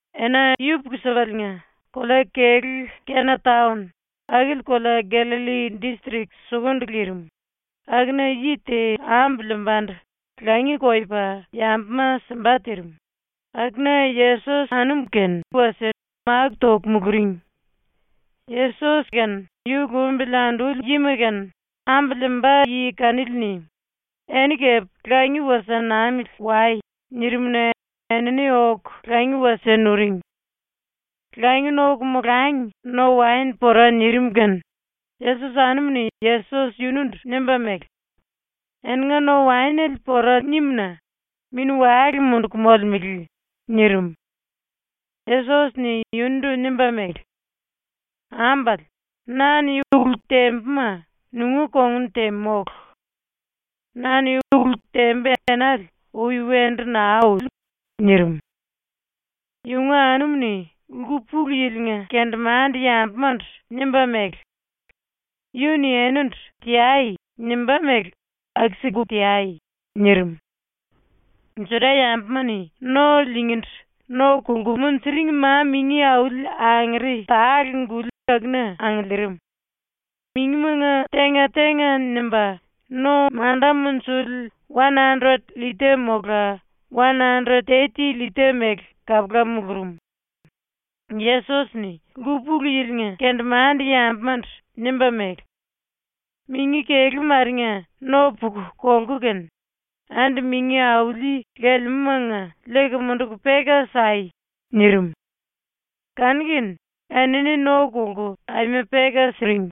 Ena yupuku-sipaliinga kolea-kelú Kena taon, akili kolea Gallalli distrik sukundu lirim, akuna yi te ambu liimbandu langi koyopa yambuma simba tirim, akuna Yesos anum-kene wasie máku toku muluring. Yesos kene yu lumbili anduli yima kene ambu liimba yi kanili-ni “Eni kepe langi wasie namili wai.” nirim-na enini oku langi wasie nuring. Langi noku molangi no-waen pora nirim kene Yesos anumu-ni Yesos yundu nimba mele: “Eninga no-waenele pora nimu-na mini-wale munduku molemele.” nirim. Yesos-ni yundu nimba mele: “Ambale, na-ni ulu tembuma nunga kongun te mólu. Na-ni ulu tembu enale ui wendu naa uli.” nirim. Yunga anumu-ni ⸤lku-pulu-yilinga⸥ kendemande-yambumandu nimba mele: “Yu-ni enindu “Teai.” nimbá mele aku-siku teai.” nirim. Juda-yambuma-ni no lingindu no kolku munjuring ma-mingi auli angere tale-guli akuna angiliirim. Mingimanga tenga-tenga nimba no manda munjuli wan andret llita mola wan andret teti llita mele kapula mulurum. Yesos-ni ⸤lku-pulu-yilinga⸥ kendemande-yambumandu nimba mele: “Mingi kelú marenga no puku kolku kene, andi mingi auli lelemúmanga liiku munduku peka sai.” nirim. Kanu-kene enini no kolku aima peka siring.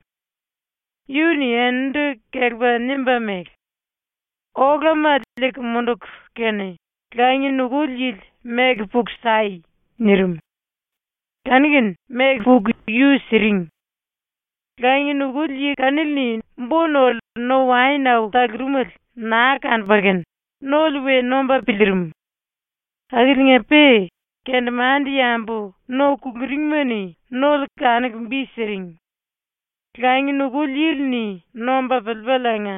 Yu-ni eninindu kelepa nimba mele: “Olama liiku munduku kene langi nukuli yili meku puku sai.” nirim. Kanu-kene meku puku yu siring. Langi nukuli yi kanili-ni bo-nole no-waen au talurumele naa kanupa kene nole we nomba piliirim. Akiliinga-pe kendemande-yambu no kuluringima-ni nole kanuku bi siring. Langi nukuli yili-ni nomba piliipaliinga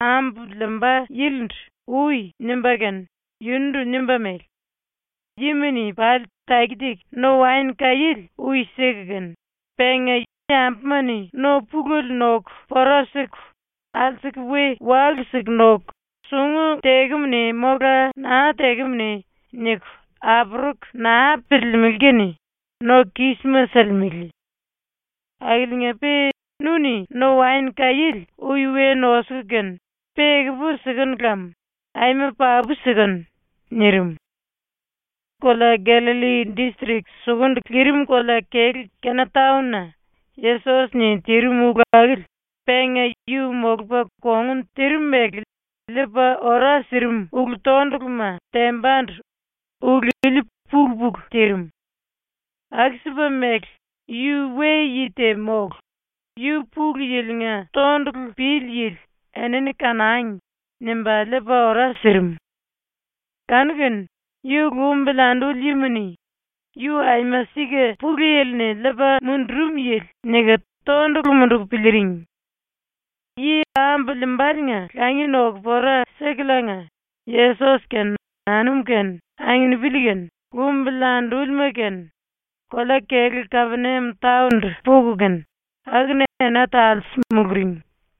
ambu liimba yilindu “Ui.” nimba kene yundu nimba mele: “Yima-ni pali taki-taki no-waen kaiéle ui siku kene, penga yambuma-ni no pulele noku pora siku alsuku we walu-siku noku ‘sungu tekemune mola naa tekemune’ niku apuruku naa piliilimili kene no kisma silimele. Akiliinga-pe nu-ni no-waen kaiéle ui we nosuku kene pe ekupu sikenu lam, ⸤aima papu sikenu⸥.” nirim. Kolea Gallalli distrik sukundu lirim kolea-kelú Kena taon-na Yesos-ni tirim ulu akili penga yu molupa kongun tirim mele liipa ora sirim ulu-tonduluma tembandu ulu ili pulu-pulu tirim. Aku-sipa mele yu we-yi te mólu, yu Pulu Yili-nga tondulu pili yili ‘enini kanangi.’ nimba liipa ora sirim. Kanu-kene yu lumbili anduli yima-ni ‘Yu aima sika ⸤Pulu Yili-ni liipa mundurum yili⸥.’ niku tondulu munduku piliiring. Yi ambu liimbaliinga langi noku pora sikuliinga Yesos kene anum kene anginipili kene lumbili andúlima kene kolea-kelú Kapeniam taon-ndu puku kene, akuna ena talse muluring.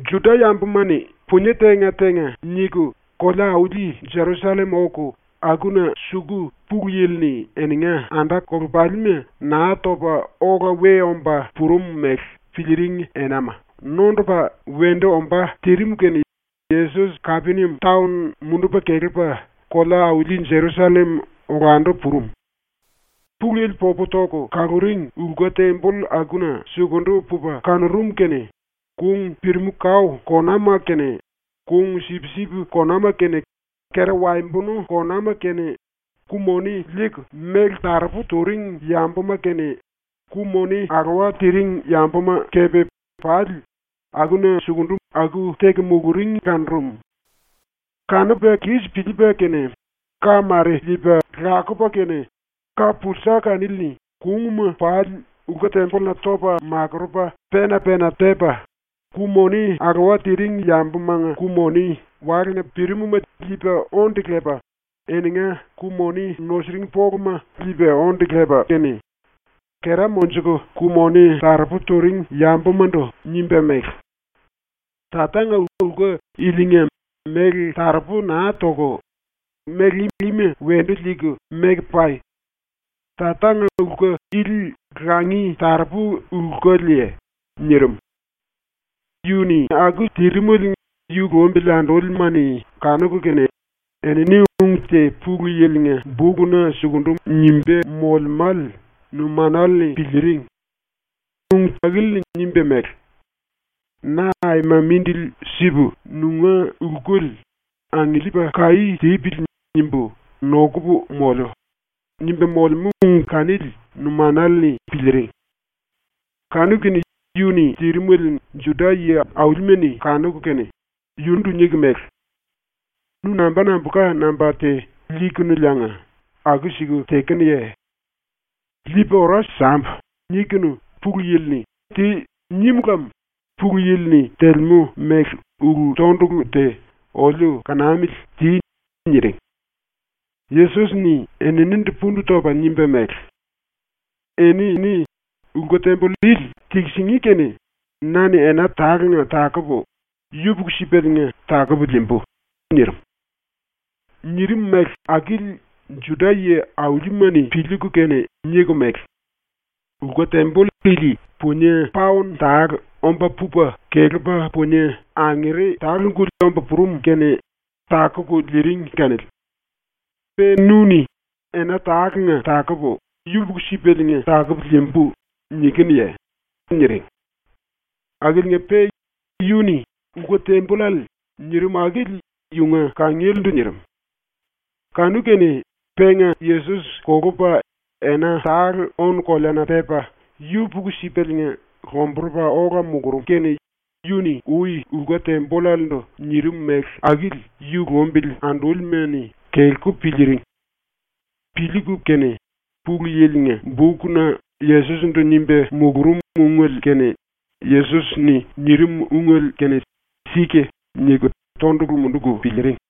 Juda-yambuma-ni punie tenga-tenga niku kolea-auli Jerusallem oku akuna suku Pulu Yili-ni eninga anda-kolepalima Naa Topa Ola We Omba Purum mele piliiring enama nondupa wendu ombá tirim kene Yesos Kapeniam taon mundupa kelepa kolea-auli Jerusallem olandu purum. ⸤Pulu Yili popu toku kaluring⸥ lku-temboll akuna sukundu pupa kanurum kene kung pirimu-kao konama kene kung sipsip konama kene kera waembonu konama kene ku-moni liiku méle taropu turing yambuma kene, ku-moni alowa tiringi yambuma kepe pali akuna sukundu aku teku muluring kanurum. Kanupa kis piliipa kene, ka mare liipa lakupa kene ka-pulsa kanili-ni kungma pali lku-tembolluna topa makurupa pena-pena tepa, ku-moni alowa tiringi yambumanga ku-moni walena pirim-ma liipa onde lepa eninga ku-moni nusiring poluma liipa onde lepa kene, kera monjuku ku-moni taropu turing yambumandu nimba mele: “Tatanga lku ilinga méle taropu naa toku, méle ima wendu liiku meku pai! Tatanga lku ili langi taropu lkuliye?” nirim. Yu-ni aku terimele yu lumbili andúlima-ni kanuku kene enini ung te Pulu Yili-nga bukna sukundu nimba molemále numanale-ni piliiring. Ung akili-ni nimba mele: “Na aima mindili sipu nunga lkuli ‘Angiliipa kaí tipili.’ nimbu nokupu moliu.” nimba molemú ung kanili numanale-ni piliiring. Kanu-kene yu-ni tirimele Juda-⸤yi auli⸥ma-ni kanuku kene yundu niku mele: “Nu namba nambulka namba te liikuliinga aku-siku tekenuye? ‘Liipu ora sambu.’ nikunu Pulu Yili-ni “Ti.” nim lem Pulu Yili-ni telemú mele ulu-tondulu te oliu kanamili ti.” niring. Yesos-ni eninindu pundu topa nimba mele: “Eni lku-temboll ili tikisingí kene na-ni ena tale-nga takupu, yupuku-sipaliinga takupu liimbu.” nirim. Nirim mele akili Juda-⸤yi auli⸥ma-ni piliiku kene niku mele: “Lku-temboll ili punie paon tale omba pupa kelepa punie angere tale-guli omba purum kene takuku liiring kanili. Pe nu-ni “Ena tale-nga takupu, yupuku-sipaliinga takupu liimbu.” nikinuye?” niring. Akiliinga-pe yu-ni “lku-tembollale” nirim akili yunga kangielendu nirim. Kanu-kene penga Yesos kolupa ena tale ónu-koleana pepa yupuku-sipaliinga lomburupa ola mulurum kene yu-ni ui lku-tembollalendu nirim mele akili yu lumbili andúlima-ni kelku piliiring. Piliiku kene Pulu Yili-nga bukna ⸤Yesos-ndu⸥ nimba mulurum ungele kene Yesos-ni nirim ungele kene ‘Sika’ niku tondulu munduku piliiring.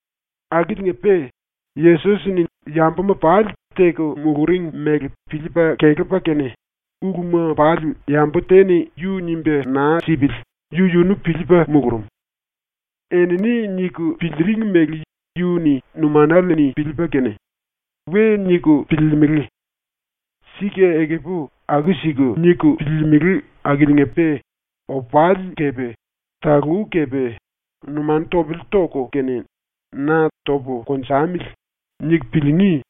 Akiliinga-pe Yesos-ni yambuma pali teku muluring mele piliipa kelepa kene uluma pali yambu te-ni yu nimba naa sipili yu-yunu piliipa mulurum. Enini niku piliiring mele yu-ni numanale-ni piliipa kene, ⸤‘We niku piliilimili. Sika ekupu aku-siku niku piliilimili akiliinga-pe opali kepe talú kepe numanu topele toku kene na ‘Topu konjamili.’ niku piliingí.’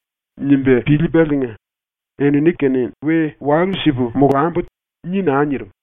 nimba piliipaliinga,⸥ ‘Enini-kene we walu-sipu molambu.’ ni naa nirim.